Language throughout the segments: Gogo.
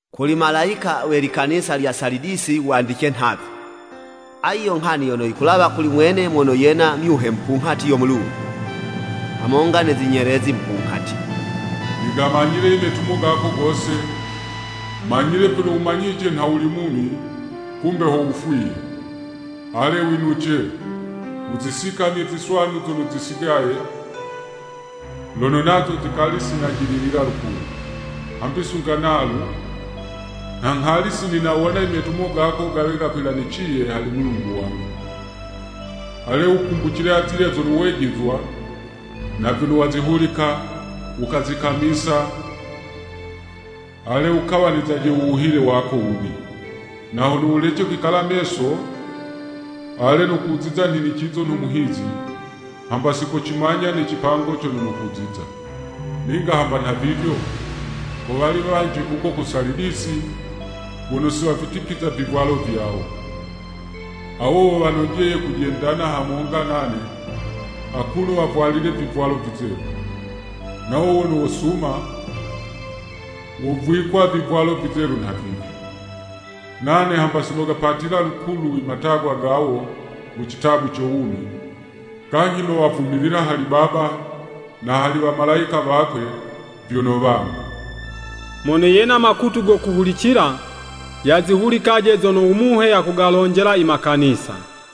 “Kuli malayika we likanisa lya Salidisi wandice nhavi, “ ‘Ayi yo nghani yono yikulawa kuli mwene mono yena myuhe mupunghati yo Mulungu, hamonga ne zinyelezi mupunghati. Nigamanyile i metumo gako gose, manyile vyono wumanyice nha wuli mumi, kumbe ho wufwiye! Ale winuce! Wuzisikamye ziswanu zono zisigaye, lono nazo zikali si najililila lukulu. Hambi sunga nalu, nha nghali sininawona i metumo gako gawe gono gakwilaniciye hali Mulungu wangu. Ale wukumbucile azilya zono wejizwa, na vyono wazihulika, wukazikamisa, ale, wukawanizaje u wuhile wako wubi. Na hono wulece kwikala meso ale, nokuziza nhinicizo nho muhizi, hamba sikocimanya ne cipango cono nokuziza. Ninga hamba nhavivyo, ko wali wanji kuko ku Salidisi, wono si wavitipiza vivwalo vyawo. Awo wo wanojeye kujendana hamonga nane, akuno wavwalile vivwalo vizelu.’ “Nawo wono wosuma, wovwikwa vivwalo vizelu nhavivi. Nane hamba si nogapatila lukulu i matagwa gawo mu citabu co wumi, kanyhi nowavumilila hali Baba na hali wamalayika wakwe, vyono wangu. Mono yena makutu go kuhulicila, yazihulikaje zono u Muhe yakugalonjela i makanisa!”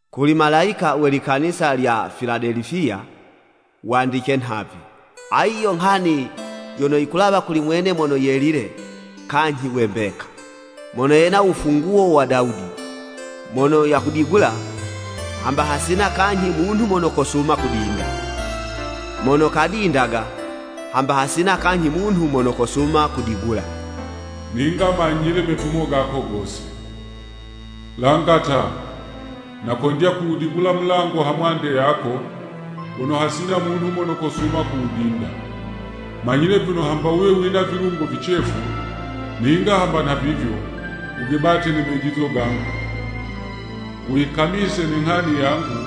“Kuli malayika we likanisa lya Filadelifiya wandice nhavi, ‘Ayi yo nghani yono yikulawa kuli mwene mono yelile kanyhi we mbeka, mono yena wufunguwo wa Dawudi, mono kawudigulaga, hamba hasina kanyhi munhu mono kosuma kudinda, mono kadindaga, hamba hasina kanyhi munhu mono kosuma kuwudigula. Ninga manyile metumo gako gose! Langa ta, nakondya kuwudigula u mulango ha mwande yako, wono hasina munhu mono kosuma kuwudinda. Manyile vyono hamba wuwe wina vilungo vicefu, ninga hamba nhavivyo, wugebate ne mejizo gangu, wuyikamise ne nghani yangu,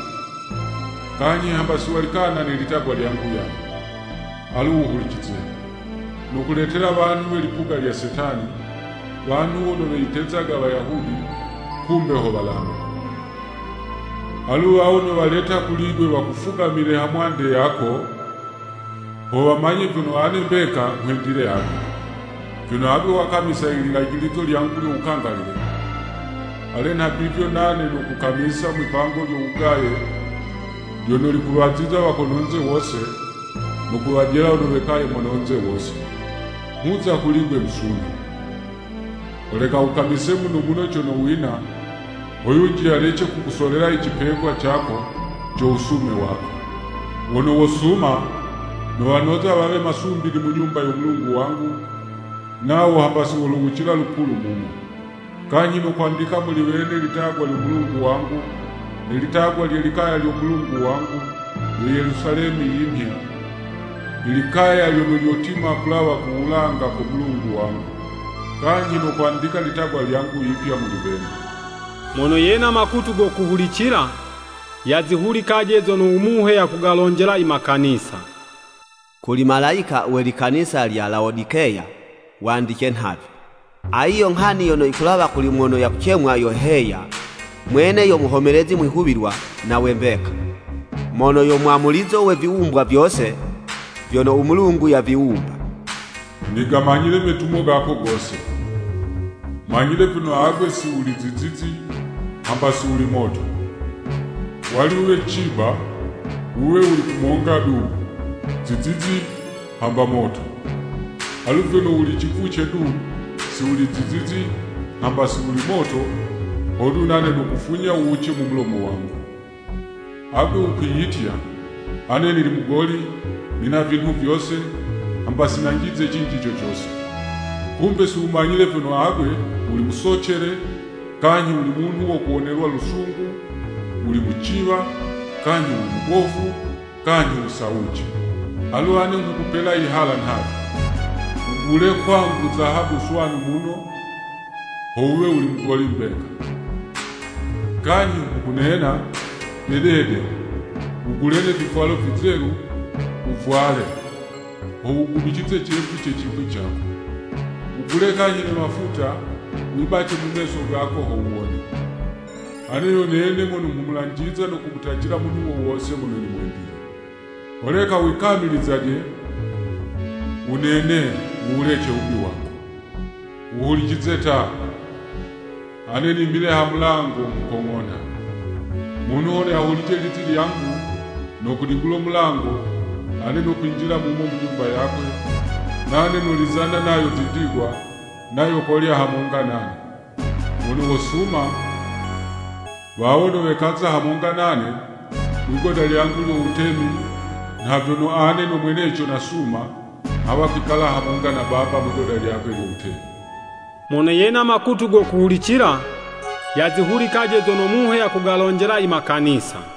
kanyhi hamba si walikana ne litagwa lyangu yaye. Alu wuhulicize! Nokuletela wanhu we lipuga lya Setani, wanhu wono weyitezaga Wayahudi, kumbe ho walambi. Alu wawo nowaleta kuli'gwe wakufugamile hamwande yako, ho wamanye vyono ane mbeka nghwendile agwe. Vyono agwe wakamisa i lilajilizo lyangu lyo wukangalile, ale nhavivyo nane nokukamisa mwi'pango lyo wugaye lyono likuwaziza wa kono'nze wose, no kuwajela wono wekaye mono'nze wose. Nghuza kuli'gwe musunho! Holeka wukamise muno muno cono wina ho yunji yalece kukusolela i cipegwa cako co wusume wako.’ “Wono wosuma, nowanoza wawe masumbili mu Nyumba yo Mulungu wangu, nawo hamba si wolowucila lukulu mumo. Kanyhi nokwandika muli wene litagwa lyo Mulungu wangu, ne litagwa lye likaya lyo Mulungu wangu, yo Yelusalemi yimhya, i likaya lyono lyotima kulawa ku wulanga ko Mulungu wangu. Kanyhi nokwandika ilitagwa lyangu yipya muli wene Mono yena makutu go kuhulicila, yazihulikaje zono u Muhe yakugalonjela i makanisa!” “Kuli malayika we likanisa lya Lawodikeya wandice nhavi, ‘Ayi yo nghani yono yikulawa kuli mono yakucemwa, yo “Heya”, Mwene yo muhomelezi mwihuwilwa na we mbeka, mono yo mwamulizo we viwumbwa vyose vyono u Mulungu yaviwumba. Nigamanyile metumo gako gose! Manyile vyono agwe si wuli zizizi, hamba si wuli moto. Wali wuwe ciba, wuwe wuli kumonga du, zizizi hamba moto. Alu vyono wuli civuce du, si wuli zizizi hamba si wuli moto, hodu nane nokufunya wuwuce mu mulomo wangu!’ Agwe wukwiyitya, ‘Ane nili mugoli, nina vinhu vyose, hamba si nyanjize cinji co cose.’ Kumbe si wumanyile vyono agwe wuli musocele, kanyhi wuli munhu wo kuwonelwa lusungu, wuli muciwa, kanyhi wuli mubofu, kanyhi wusawuce! Alu ane nghukupela yihala nhavi, wugule kwangu zahabu swanu muno, ho wuwe wuli mugoli mbeka. Kanyhi nghukunena, dedede, wugule ne vivwalo vizelu, wuvwale, ho wugubicize cevu ce cipwi cako. Wugule kanyhi ne mafuta, wibace mu meso gako ho wuwone. Ane yo nene mono nghumulanjiza no kumutacila munhu wo wose mono nimwendile. Holeka wikamilizaje, wunene, wu wulece wubi wako. Wuhulicize ta! Ane nimile ha mulango, nghukong'onha. Munhu hono yalihulice lizi lyangu, no kudigulo mulango, ane nokwinjila mumo mu nyumba yakwe, nane nolizana nayo zindigwa, nayo kolya hamonga nane. “Wono wosuma, wawo nowekaza hamonga nane mwi'goda lyangu lyo wutemi nha vyono ane no mweneco nasuma, nghawa kwikalana hamonga na Baba mwigoda lyakwe lyo wutemi. Mono yena makutu go kuhulicila, yazihulikaje zono Muhe yakugalonjela i makanisa!”